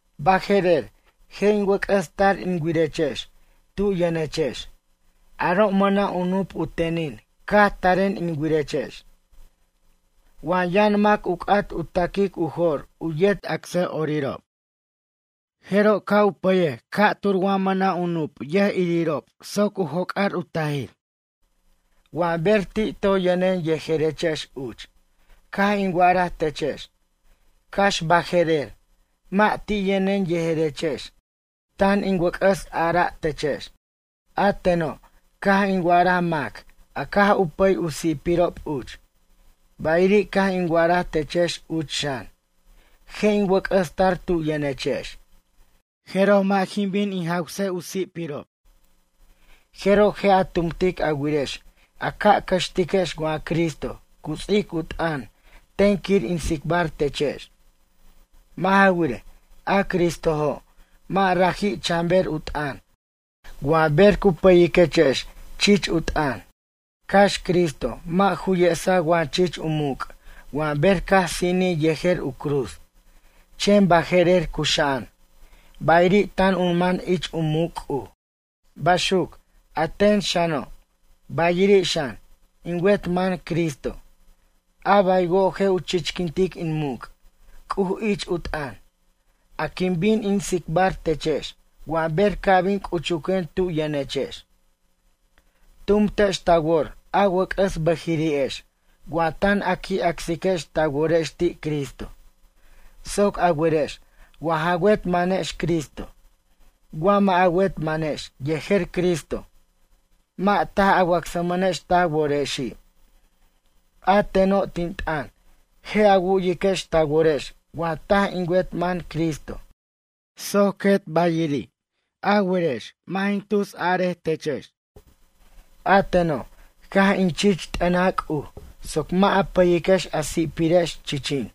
Baje'rer, je' in wʌc'ʌs tar in wirechex tu yʌnechex, aro' mʌna' u nup u tenin caj taren in wirechex. Wa yʌn mac u c'at u ta'quic u jo'r u yet acsa'orirob, jeroj ca' u pʌyej dos wa mʌna' u nup yʌjirirob soc u joc'ar u tajir. Wa ber ti' toy yʌnen yejerechex uch, caj in wa'araj techex, cax baje'rer, mʌ' ti' yʌnen yejerechex tan in wʌc'ʌs ara techex. A teno' caj in wa'araj mac a caj u pʌy u si'pirob uch, bayiri' caj in wa'araj techex uch xan, je' in wʌc'ʌs tar tu yʌnechex, jeroj mʌ' jin bin in jaws u si'pirob. Jeroj je' a tumtic a wirex a ca cʌxtiquex wa Cristo cu ts'ic u t'ʌn ten quir in tsicbar techex. Mʌ' ja wirej, a Cristojo' mʌ' raji' chan ber u t'ʌn wa ber cu pʌyiquechex chich u t'ʌn. Cax Cristo mʌ' ju yesaj wa chich u muc' wa ber caj sinij yejer u cruz, chen baje'rer cuxa'an, bayiri' tan u man ich u muc' C'uj. Baxuc, a ten xano', bayiri' xan, in wet man Cristo, a baywo' je' u chichquintic in muc' C'uj ich u t'ʌn, a quin bin in tsicbar techex wa ber ca' bin c'uchuquen tu yʌnechex. Tumtex ta wor a wʌc'ʌs bʌjiri'ex wa tan a qui' acsiquex ta worex ti' Cristo soc a werex wa ja wet manex Cristo. Wa mʌ' a wet manex yejer Cristo mʌ' taj a wacsmʌnex ta worexi'. A teno' tin t'ʌn, je' a wu'yiquex ta worex wa taj in wet man Cristo, soc quet bayiri', a werex mʌ' jin tus ar techex. A teno' caj in chich t'ʌna C'uj soc mʌ' a pʌyiquex a si'pirex, chichin.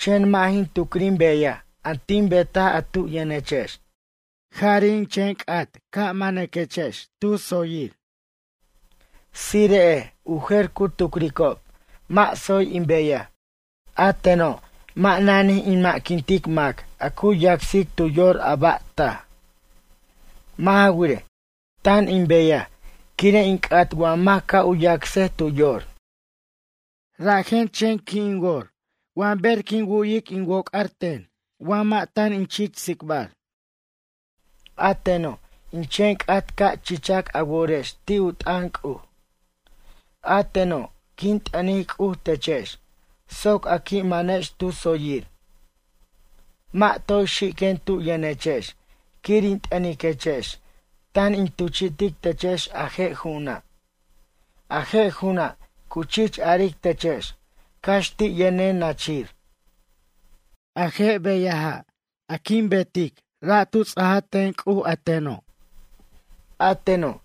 Chen mʌ' jin tucr in beyaj a tin betaj a tu yʌnechex. Jari' in chen c'at ca' manaquechex tu tsoyir. Tsire'ej u jer cu tucricob mʌ' tsoy in beyaj. A teno' mʌ' nanij in mʌ'quintic mac a cu yacsic tu yor a ba' taj. Mʌ' ja wirej, tan in beyaj quire' in c'at wa mac ca' u yacsej tu yor. Rajen chen qui' in wor wa ber quin wu'yic yoc'or ten wa mʌ' tan in chich tsicbar. A teno' in chen c'at ca' chichac a worex ti' u t'ʌn C'uj. A teno' quin t'ʌnic C'uj techex soc a qui' manex tu tsoyir. Mʌ' toy xiquen tu yʌnechex quir in t'ʌniquechex tan in tuchi'tic techex a je' ju'una'. A je' ju'una' cu chich aric techex cax ti' yʌnen nachir. A je' beyaja' a quin betic ra' tu ts'a ten C'uj a teno'. A teno'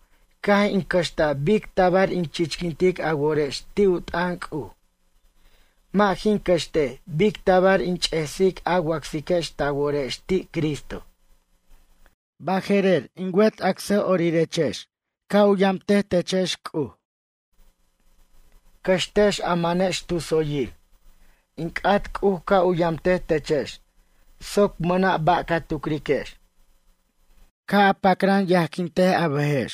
caj in cʌxta bic tabar in chichquintic a worex ti' u t'ʌn C'uj. Mʌ' jin cʌxte bic tabar in ch'esic a wacsiquex ta worex ti' Cristo. Baje'rer in wet acsa'orirex ca' u yamtej techex C'uj. Cʌxtex a manex tu tsoyir. In c'at C'uj ca' u yamtej techex soc mʌna' ba' ca tucriquex. Ca' a pacran yajquint a bʌjex.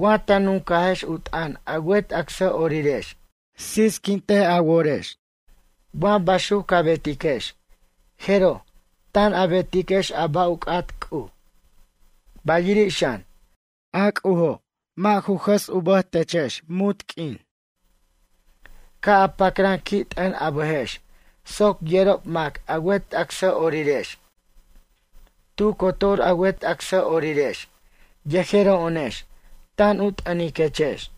Wa ta nuncajex u t'ʌn a wet acsa'orirex, sisquint a worex. Wa baxuc ca betiquex, jeroj, tan a betiquex a ba' u c'at C'uj. Bayiri' xan, a C'ujo' mʌ' ju jʌs u bʌj techex munt q'uin. Ca' a pacran qui' t'ʌn a bʌjex soc yerob mac a wet acsa'orirex. Tu cotor a wet acsa'orirex yejero'onex tan u t'ʌniquechex.